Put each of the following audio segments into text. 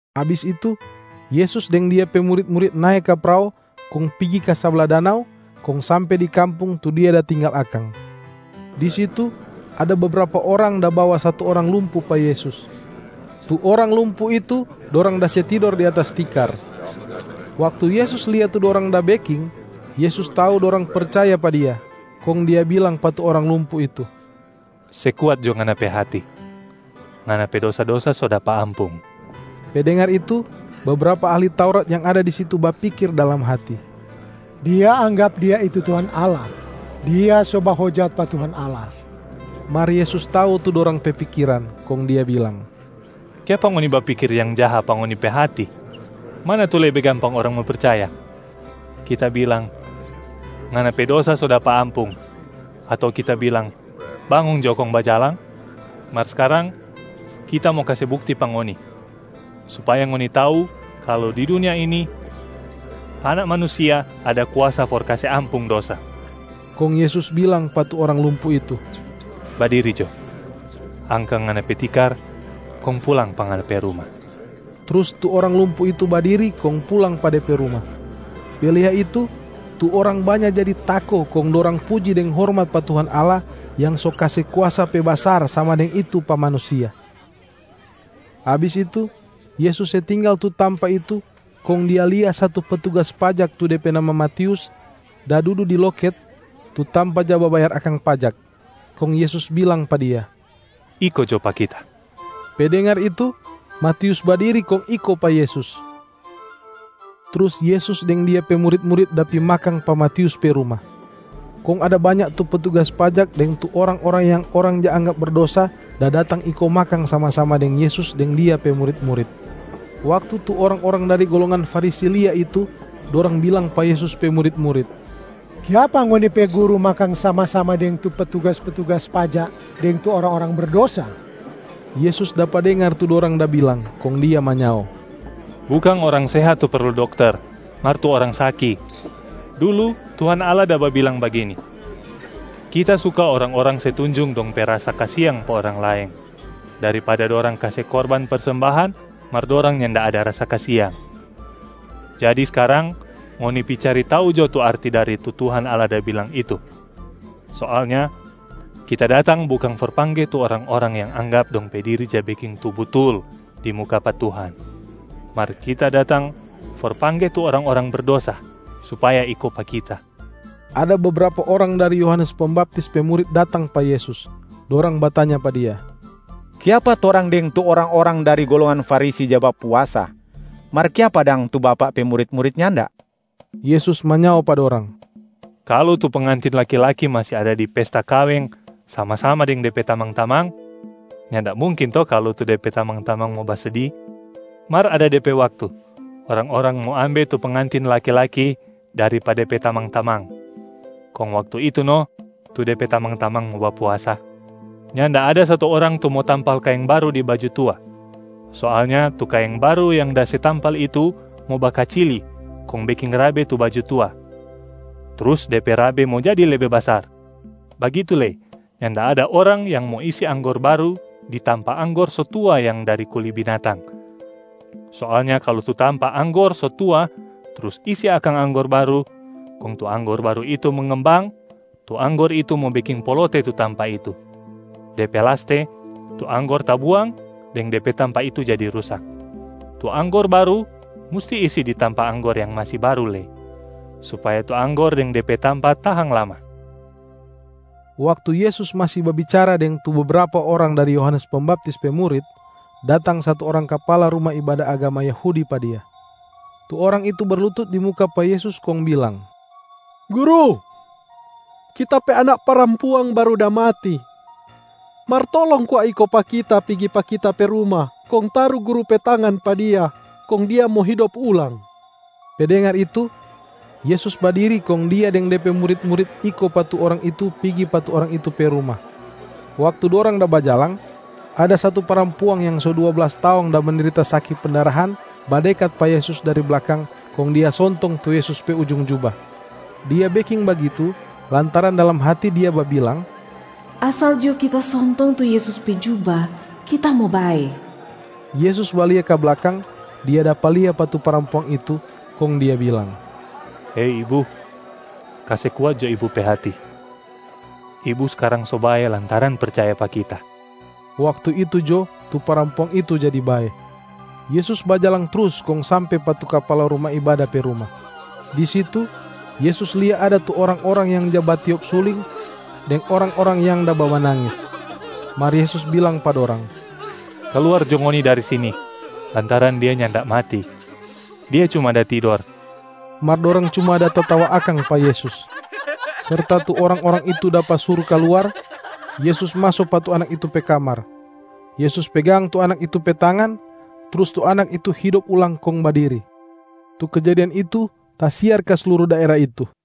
Abis itu, Yesus deng Dia pe murit-murit nae ka prao kong pigi ka sabla danau kong sampe di kampung tu Dia da tinggal akang.a Di situ ada bebrapa orang da bawa satu orang lumpu pa Yesus. Tu orang lumpu itu dorang da se tidor di atas tikar. Waktu Yesus lia tu dorang da beking, Yesus tau dorang percaya pa Dia, kong Dia bilang pa tu orang lumpu itu, “Se kuat jo nganab pe hati! Ngana pe dosa-dosa so dapa ampung.” Pe dengar itu, bebrapa ahli Taurat yang ada di situ bapikir dalam hati, “Dia anggap Dia itu Tuhan Allah, Dia so bahojat pa Tuhan Allah.” Mar Yesus tau tu dorang pe pikiran, kong Dia bilang, “Kiapa ngoni bapikir yang jaha pa ngoni pe hati? Mana tu lebe gampang orang mo percaya? Kita bilang, ‘Ngana pe dosa so dapa ampung,’ ato Kita bilang, ‘Bangong jo kong bajalang’? Mar skarang, Kita mo kase bukti pa ngoni supaya ngoni tau kalu di dunia ini Anak Manusia ada kuasa for kase ampung dosa.” Kong Yesus bilang pa tu orang lumpu itu, “Badiri jo, angka ngana pe tikar, kong pulang pa ngana pe ruma!” Trus tu orang lumpu itu badiri kong pulang pa de pe ruma. Pe lia itu, tu orang banya jadi tako kong dorang puji deng hormat pa Tuhan Allah yang so kase kuasa pe basar sama deng itu pa manusia. Abis itu Yesus se tinggal tu tampa itu, kong Dia lia satu petugas pajak tu de pe nama Matius, da dudu di loket, tu tampa ja babayar akang pajak. Kong Yesus bilang pa dia, “Iko jo pa Kita.” Pe dengar itu, Matius badiri kong iko pa Yesus. Trus Yesus deng Dia pe murit-murit da pi makang pa Matius pe ruma. Kong ada banya tu petugas pajak deng tu orang-orang yang orang ja anggap berdosa da datang iko makang sama-sama deng Yesus deng Dia pe murit-murit. Waktu tu orang-orang dari golongan Farisi lia itu, dorang bilang pa Yesus pe murit-murit, “Kiapa ngoni pe guru makang sama-sama deng tu petugas-petugas pajak deng tu orang-orang berdosa?” Yesus dapa dengar tu dorang da bilang, kong Dia manyao, “Bukang orang sehat tu perlu dokter mar tu orang saki. Dulu Tuhan Allah da babilang bagini, ‘Kita suka orang-orang se tunjung dong pe rasa kasiang pa orang laeng, daripada dorang kase korban persembahan mar dorang nyanda ada rasa kasiang.’ Jadi skarang ngoni pi cari tau jo tu arti dari tu Tuhan Allah da bilang itu. Soalnya Kita datang bukang for pangge tu orang-orang yang anggap dong pe diri ja beking tu butul di muka pa Tuhan, mar Kita datang for pangge tu orang-orang berdosa supaya iko pa Kita.” Ada bebrapa orang dari Yohanes Pembaptis pe murit datang pa Yesus. Dorang batanya pa Dia, “Kiapa torang deng tu orang-orang dari golongan Farisi ja bapuasa mar kiapa dang tu Bapak pe murit-murit nyanda?” Yesus manyao pa dorang, “Kalu tu pengantin laki-laki masi ada di pesta kaweng sama-sama deng de pe tamang-tamang, nyanda mungkin to kalu tu de pe tamang-tamang mo basedi. Mar ada de pe waktu orang-orang mo ambe tu pengantin laki-laki dari pa de pe tamang-tamang, kong waktu itu no tu de pe tamang-tamang mo bapuasa.c Nyanda ada satu orang tu mo tampal kaeng baru di baju tua. Soalnya tu kaeng baru yang da se tampal itu mo bakacili kong beking rabe tu baju tua, trus de pe rabe mo jadi lebe basar. Bagitu lei, nyanda ada orang yang mo isi anggor baru di tampa anggor so tua yang dari kuli binatang. Soalnya kalu tu tampa anggor so tua, trus isi akang anggor baru, kong tu anggor baru itu mengembang, tu anggor itu mo beking polote tu tampa itu. De pe laste, tu anggor tabuang deng de pe tampa itu jadi rusak. Tu anggor baru musti isi di tampa anggor yang masi baru lei, supaya tu anggor deng de pe tampa tahang lama.”d Waktu Yesus masi babicara deng tu bebrapa orang dari Yohanes Pembaptis pe murit, datang satu orang kapala ruma ibada agama Yahudi pa Dia. Tu orang itu berlutut di muka pa Yesus kong bilang, “Guru, kita pe anak parampuang baru da mati. Mar tolong kwa iko pa kita pigi pa kita pe ruma kong taru Guru pe tangan pa dia, kong dia mo hidop ulang.” Pe dengar itu, Yesus badiri kong Dia deng De pe murit-murit iko pa tu orang itu pigi pa tu orang itu pe ruma. Waktu dorang da bajalang, ada satu parampuang yang so dua blas taong da mendrita saki pendarahan badekat pa Yesus dari blakang kong dia sontong tu Yesus pe ujung juba. Dia beking bagitu lantaran dalam hati dia babilang, “Asal jo kita sontong tu Yesus pe juba, kita mo bae.” Yesus balia ka blakang, Dia dapa lia pa tu parampuang itu, kong Dia bilang, “Hei ibu, kase kuat jo ibu pe hati! Ibu skarang so bae lantaran percaya pa Kita.” Waktu itu jo tu parampuang itu jadi bae. Yesus bajalang trus kong sampe pa tu kapala ruma ibada pe ruma. Di situ Yesus lia ada tu orang-orang yang ja batiop suling, deng orang-orang yang da bamanangis. Mar Yesus bilang pa dorang, “Kaluar jo ngoni dari sini lantaran dia nyanda mati, dia cuma da tidor.” Mar dorang cuma da tatawa akang pa Yesus. Serta tu orang-orang itu dapa suru kaluar, Yesus maso pa tu anak itu pe kamar. Yesus pegang tu anak itu pe tangan, trus tu anak itu hidop ulang kong badiri. Tu kejadian itu tasiar ka sluru daera itu.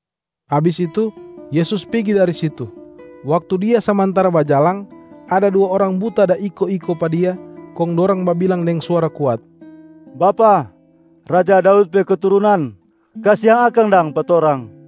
Abis itu, Yesus pigi dari situ. Waktu Dia samantara bajalang, ada dua orang buta da iko-iko pa Dia, kong dorang babilang deng suara kuat, “Bapak, raja Daud pe keturunan, kasiang akang dang pa torang!”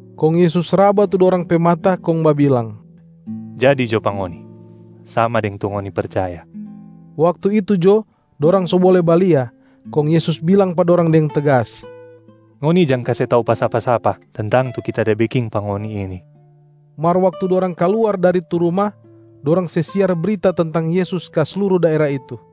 Kong Yesus raba tu dorang pe mata kong babilang, “Jadi jo pa ngoni sama deng tu ngoni percaya.” Waktu itu jo dorang so bole balia, kong Yesus bilang pa dorang deng tegas, “Ngoni jang kase tau pa sapa-sapa tentang tu Kita da beking pa ngoni ini.” Mar waktu dorang kaluar dari tu ruma, dorang se siar brita tentang Yesus ka sluru daera itu.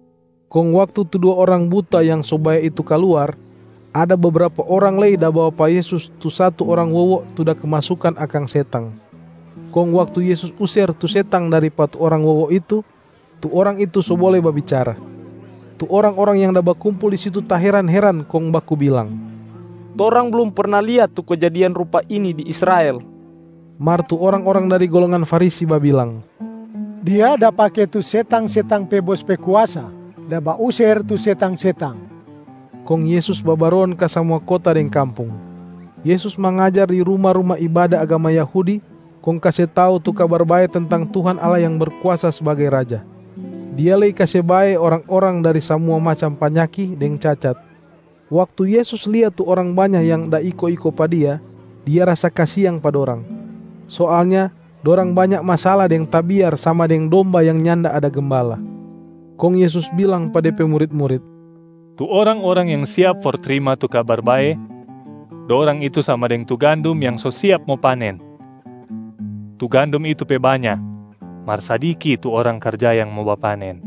Kong waktu tu dua orang buta yang so bae itu kaluar, ada bebrapa orang lei da bawa pa Yesus tu satu orang wowo tu da kemasukan akang setang. Kong waktu Yesus user tu setang dari pa tu orang wowo itu, tu orang itu so bole babicara. Tu orang-orang yang da bakumpul di situ taheran-heran kong baku bilang, “Torang blum perna lia tu kejadian rupa ini di Israel!” Mar tu orang-orang dari golongan Farisi babilang, “Dia da pake tu setang-setang pe bos pe kuasa da bauser tu setang-setang.” Kong Yesus babaron ka samua kota deng kampung. Yesus mangajar di ruma-ruma ibada agama Yahudi kong kase tau tu Kabar Bae tentang Tuhan Allah yang Berkuasa sbagai Raja. Dia lei kase bae orang-orang dari samua macam panyaki deng cacat. Waktu Yesus lia tu orang banya yang da iko-iko pa Dia, Dia rasa kasiang pa dorang. Soalnya dorang banya masala deng tabiar sama deng domba yang nyanda ada gembala. Kong Yesus bilang pa Dia pe murit-murit, “Tu orang-orang yang siap for trima tu Kabar Bae, dorang itu sama deng tu gandum yang so siap mo panen. Tu gandum itu pe banya, mar sadiki tu orang karja yang mo bapanen.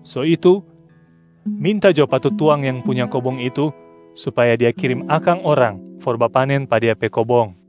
So itu, minta jo pa tu tuang yang punya kobong itu supaya Dia kirim akang orang for bapanen pa Dia pe kobong.”